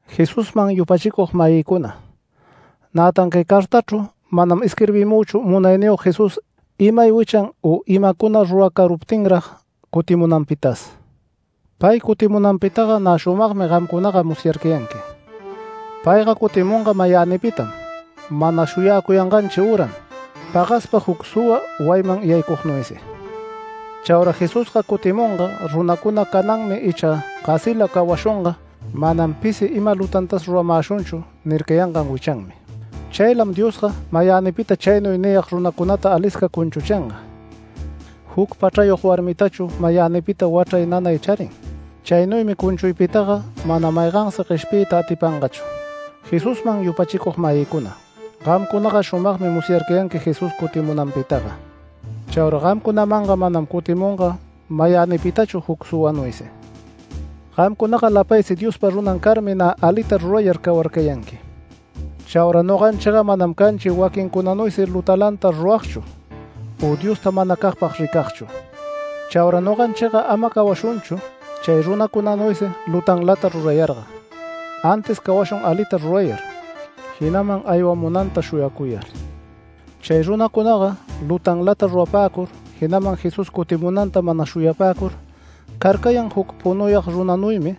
Jesusman yupachicug-mayïcuna, nätan cay cartachru manam isquirbimüchu Munayniyog Jesús imay wichan u imacuna ruracaruptinrag cutimunanpitas. Pay cutimunanpitaga nä shumagmi gamcunaga musyarcayanqui. Payga cutimunga mayänipitam mana shuyacuyanganchi üram, pagaspa juc suwa wayiman yaycugnuysi. Chaura Jesusga cutimunga runacuna “Cananmi icha gasila cawashunga, manam pisi ima lutantas ruramäshunchu” nircayangan wichanmi. Chaylam Diosga mayänipita chaynuy niyag runacunata alisca cunchuchinga. Juc pachrayog warmitachu mayänipita wachray nanay charin, chaynuymi cunchuypitaga mana maygansi gueshpiyta atipangachu. Jesusman yupachicug-mayïcuna, gamcunaga shumagmi musyarcayanqui Jesús cutimunanpitaga. Chaura gamcunamanga manam cutimunga mayänipitachu juc suwanuysi. Gamcunaga lapaysi Diospa runan carmi nä alita rurayar cawarcayanqui. Chaura noganchiga manam canchi waquincunanuysi lutalanta ruragchu u Diosta manacagpag ricagchu. Chaura noganchiga ama cawashunchu chay runacunanuysi lutanlata rurayarga, antis cawashun alita rurayar, jinaman aywamunanta shuyacuyar. Chay runacunaga lutanlata rurapäcur, jinaman Jesús cutimunanta mana shuyapäcur carcayan juc punuyag runanuymi,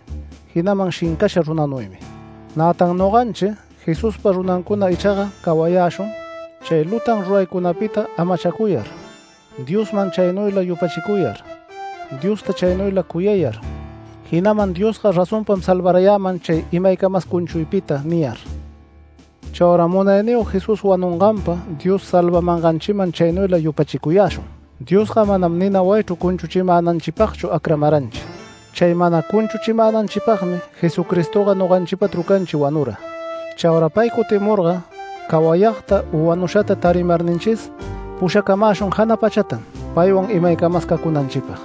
jinaman shincasha runanuymi. Nätan noganchi Jesuspa runancuna ichaga cawayäshun, chay lutan ruraycunapita amachacuyar, Diosman chaynuyla yupachicuyar, Diosta chaynuyla cuyayar, jinaman “Diosga razonpam salvarayäman chay imaycamas cunchuypita” niyar. Chauraga Munayniyog Jesús wanunganpa Dios salvamanganchiman chaynuyla yupachicuyäshun. Diosga manam nina wayichru cunchuchimänanchipagchu acramaranchi. Chay mana cunchuchimänanchipagmi Jesucristoga noganchipa trucanchi wanura. Chaura pay cutimurga cawayagta u wanushata tarimarninchis pushacamäshun jana pachatam paywan imaycamas cacunanchipag.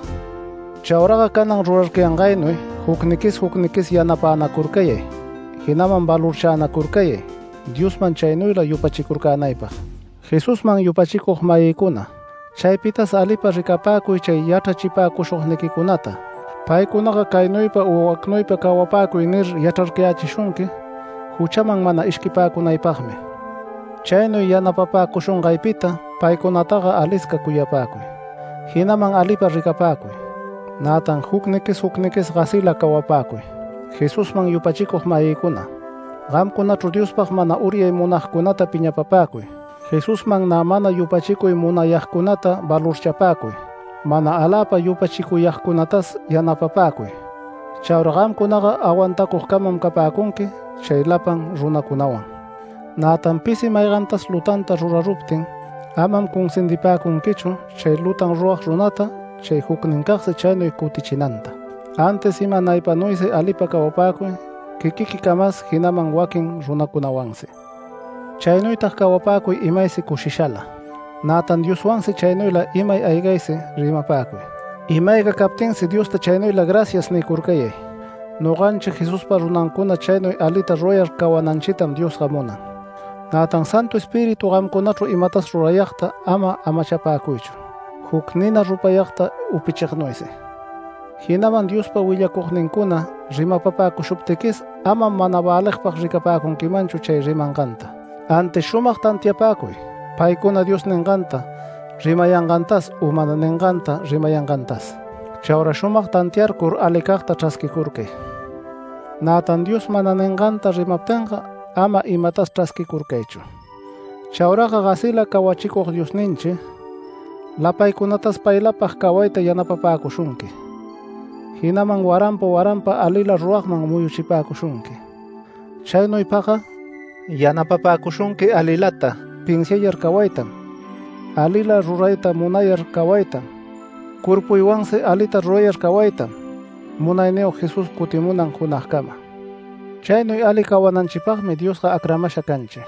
Chauraga canan rurarcayangaynuy jucniquis jucniquis yanapänacurcayay, jinaman valorchänacurcayay Diosman chaynuyla yupachicurcänaypag. Jesusman yupachicug-mayïcuna, chaypitas alipa ricapäcuy chay yachrachipäcushugniquicunata, paycunaga “Caynuypa u wacnuypa cawapäcuy” nir, yachrarcayächishunqui juchaman mana ishquipäcunaypagmi. Chaynuy yanapapäcushungaypita paycunataga alisca cuyapäcuy, jinaman alipa ricapäcuy. Nätan jucniquis jucniquis gasila cawapäcuy. Jesusman yupachicug-mayïcuna, gamcunachru Diospag mana uryay munagcunata piñapapäcuy, Jesusman nä mana yupachicuy munayagcunata valorchapäcuy, mana aläpa yupachicuyagcunatas yanapapäcuy. Chaura gamcunaga awantacugcamam capäcunqui chay lapan runacunawan. Nätan pisi maygantas lutanta ruraruptin, amam cunsindipäcunquichu chay lutan rurag runata chay jucnincagsi chaynuy cutichinanta. Antis imanaypanuysi alipa cawapäcuy quiquiquicamas, jinaman waquin runacunawansi. Chaynuytag cawapäcuy imaysi cushishala. Nätan Dioswansi chaynuyla imay aygaysi rimapäcuy. Ima-ayga captinsi Diosta chaynuyla “Gracias” nicurcayay. Noganchi Jesuspa runancuna chaynuy alita rurayar cawananchitam Diosga munan. Nätan Santu Espíritu gamcunachru imatas rurayagta ama amachapäcuychu, juc nina rupayagta upichignuysi. Jinaman Diospa willacugnincuna rimapapäcushuptiquis amam mana väligpag ricapäcunquichu chay rimanganta. Antis shumag tantiapäcuy paycuna Dios ninganta rimayangantas u mana ninganta rimayangantas. Chaura shumag tantiarcur alicagta chrasquicurcay. Nätan Dios mana ninganta rimaptinga ama imatas chrasquicurcaychu. Chauraga gasila cawachicug Diosninchi lapaycunatas paylapag cawayta yanapapäcushunqui, jinaman waranpa waranpa alila ruragman muyuchipäcushunqui. Chaynuypagga yanapapäcushunqui alilata pinsiayar cawaytam, alila rurayta munayar cawaytam, cuerpuwansi alita rurayar cawaytam Munayniyog Jesús cutimunan junagcama. Chaynuy ali cawananchipagmi Diosga acramasha canchi.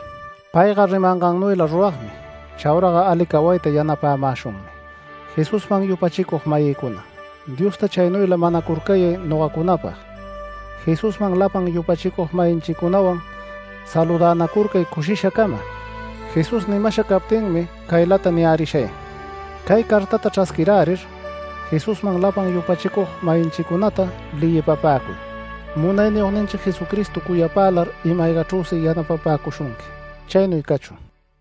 Payga rimangannuyla ruragmi, chauraga ali cawayta yanapämäshunmi. Jesusman yupachicug-mayïcuna, Diosta chaynuyla manacurcayay nogacunapag. Jesusman lapan yupachicug-mayinchicunawan saludänacurcay cushishacama. Jesús nimasha captinmi caylata niyärishay: Cay cartata chrasquirärir Jesusman lapan yupachicug-mayinchicunata leyipapäcuy. Munayniyogninchi Jesucristo cuyapälar ima-aygachrüsi yanapapäcushunqui. Chaynuy cachun.